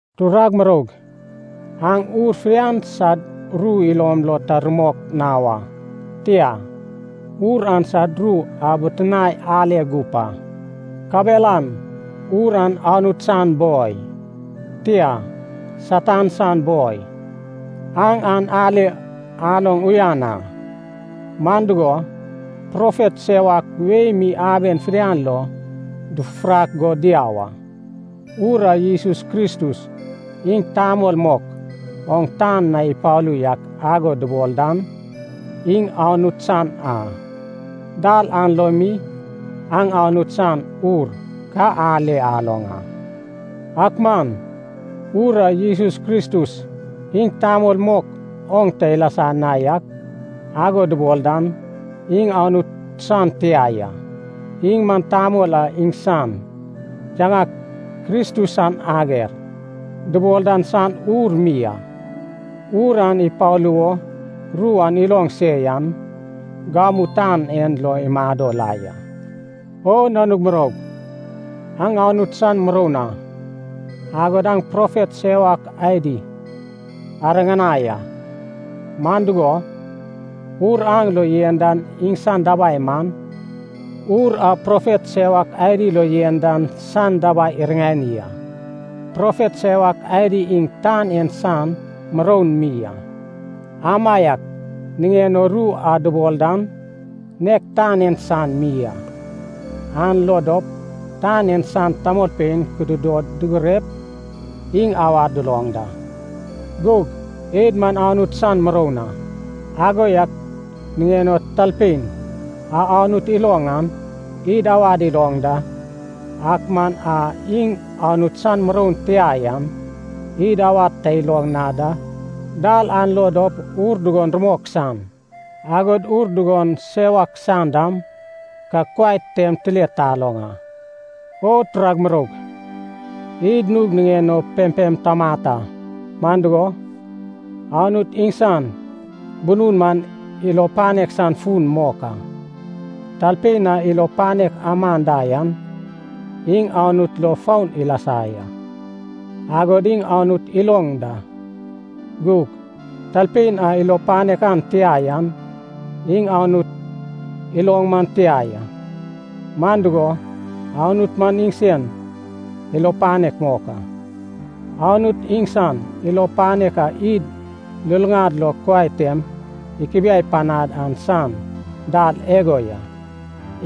Turag muroug, aŋ ur fidian sad ru ilom lo ta rumok na wa. Tia, ur an sad ru abitinae ale gup a, kabelan ur an Anut san boi, tia, Satan san boi, aŋ an ale aloŋ uyan a. Man dugo, profet sewak wei mi aben fidian lo dufufurak go diau a. Ur a Jesus Kristus iŋ tamol mok oŋ tan na ipalu yak ago dubol dan, iŋ Anut san a. Dal an lo mi aŋ Anut san Ur ka ale aloŋ a. Ak man ur a Jesus Kristus iŋ tamol mok oŋ ta ilasa na yak ago dubol dan, iŋ Anut san tia ya. Iŋ man tamol a iŋsan yaŋak “Kristus san ager” dubol dan san ur mi a. Ur an ipalu wo ru an aloŋ se yan, gamu tan en lo imado la ya. O nanug muroug, aŋ Anut san muroun a, agod aŋ profet sewak adi ariŋanai a. Man dugo, Ur aŋ lo yen dan iŋsan dabai man, ur a profet sewak adi lo yen dan san dabai iriŋani a. Profet sewak adi iŋ tan en san muroun mi a, amaiak niŋen o ru a dubol dan, nek tan en san mi a. An lo dop tan en san tamolpein kukudod dugurep iŋ awad duloŋ da. Gug id man Anut san muroun a. Ago yak niŋen o talpein a Anut iloŋ an, id awad iloŋ da, ak man a iŋ Anut san muroun tia yan, id awad ta iloŋ na da. Dal an lo dop ur dugon rumok san, agod ur dugon sewak san dam ka kuai tem tile taloŋ a. O turag muroug, id nug niŋen o pempem tamat a, man dugo, Anut iŋsan bunun man ilo panek san fun mok a. Talpein a ilo panek aman da yan, iŋ Anut lo foun ilasa ya, agod iŋ Anut iloŋ da. Gug talpein a ilo panek an tia yan, iŋ Anut iloŋ man tia ya. Man dugo, Anut man iŋsen ilo panek mok a. Anut iŋsan ilo panek a id luluŋad lo kuai tem ikubiai panad an san dal igo ya.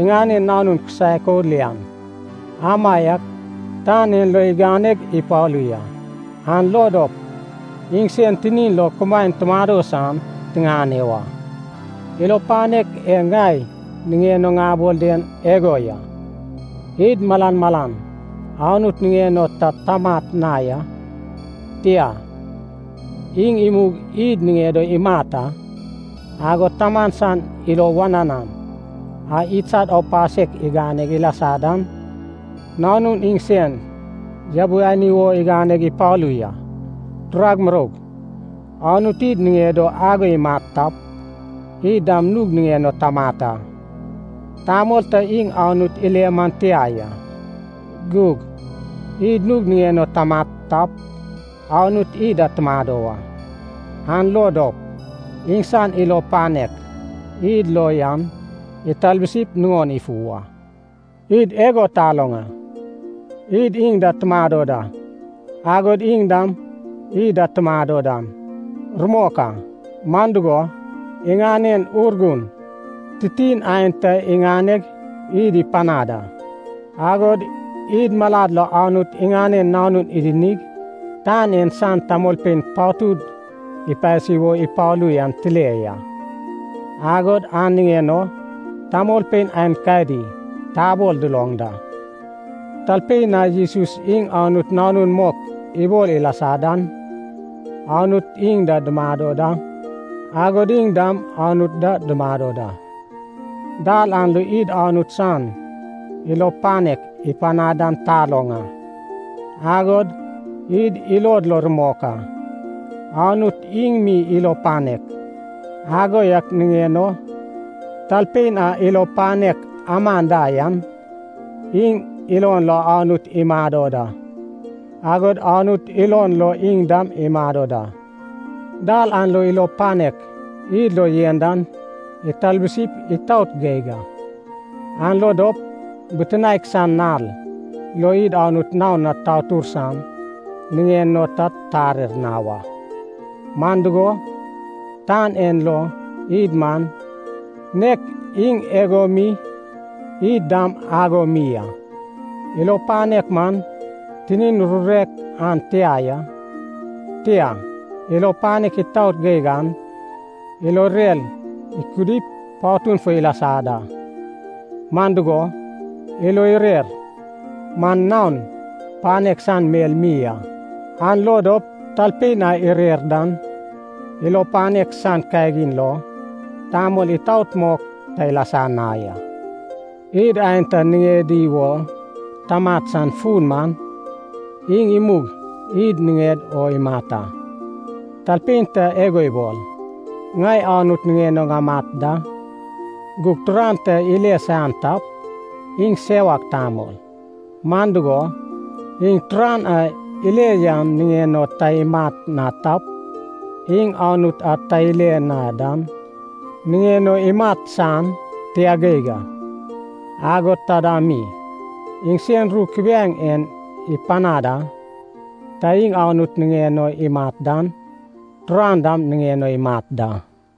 Iŋanen Nanun kisaek o lian amaiak tan en lo iganeg ipalu ya, an lo dop iŋsen tinin lo kumaen tumado san tiŋane wa. Ilo panek e ŋai niŋen o ŋabol den igo ya. Id malan malan Anut niŋen o ta tamat na ya, tia, iŋ imug id niŋed o imat a. Agod Taman san ilo wananan a idsad aupasek igane ilasa dan, Nanun iŋsen yabiani wo iganeg ipalu ya. Turag muroug, Anut id niŋed o ago imat tap, id dam nug niŋen o tamat a. Tamol ta iŋ Anut ile man tia ya. Gug id nug niŋen o tamat tap, Anut id da tumado wa, an lo dop iŋsan ilo panek id lo yan italbusip nuŋon ifu wa. Id igo taloŋ a, id iŋ da tumado da, agod iŋ dam id da tumado dan, rumok a. Man dugo, iŋanen Urgun titin aenta iŋaneg id ipanad a. Agod id malad lo Anut iŋanen Nanun idinig tan en san tamolpein patud ipasi wo ipalu yan tile ya, agod an niŋen o tamolpein aenkadi tabol duloŋ da. Talpein a Jesus iŋ Anut Nanun mok ibol ilasa dan, Anut iŋ da dumado da, agod iŋ dam Anut da dumado da. Dal an lo id Anut san ilo panek ipanad dan taloŋ a, agod id ilod lo rumok a. Anut iŋ mi ilo panek. Ago yak niŋen o talpein a ilo panek aman da yan, iŋ ilon lo Anut imado da, agod Anut ilon lo iŋ dam imado da. Dal an lo ilo panek id lo yen dan italbusip itaot geig a. An lo dop bitinaek san nal lo id Anut naon na tatur san niŋen o ta tarer na wa. Man dugo, tan en lo id man, nek iŋ igo mi id dam ago mi a. Ilo panek man tinin rurek an tia ya. Tia, ilo panek itaot geig an ilo irer ikudip patun fo ilasa da. Man dugo, ilo irer man naon panek san mel mi a, an lo dop talpein a irer dan, ilo panek san kagin lo tamol itaot mok ta ilasa na ya. Id aenta niŋedi wo tamat san fun man iŋ imug id niŋed o imat a. Talpein ta igo ibol, “Ŋai Anut niŋen o ŋamat da,” gug turan ta ile saian tap, iŋ sewak tamol. Man dugo, iŋ turan a ile yan niŋen o ta imat na tap, iŋ Anut a ta ile na dan niŋen o imat san tia geig a. Agod taida mi, iŋsen ru kubiaeŋ en ipanad a, ta iŋ Anut niŋen o imat dan turan dam niŋen o imat da.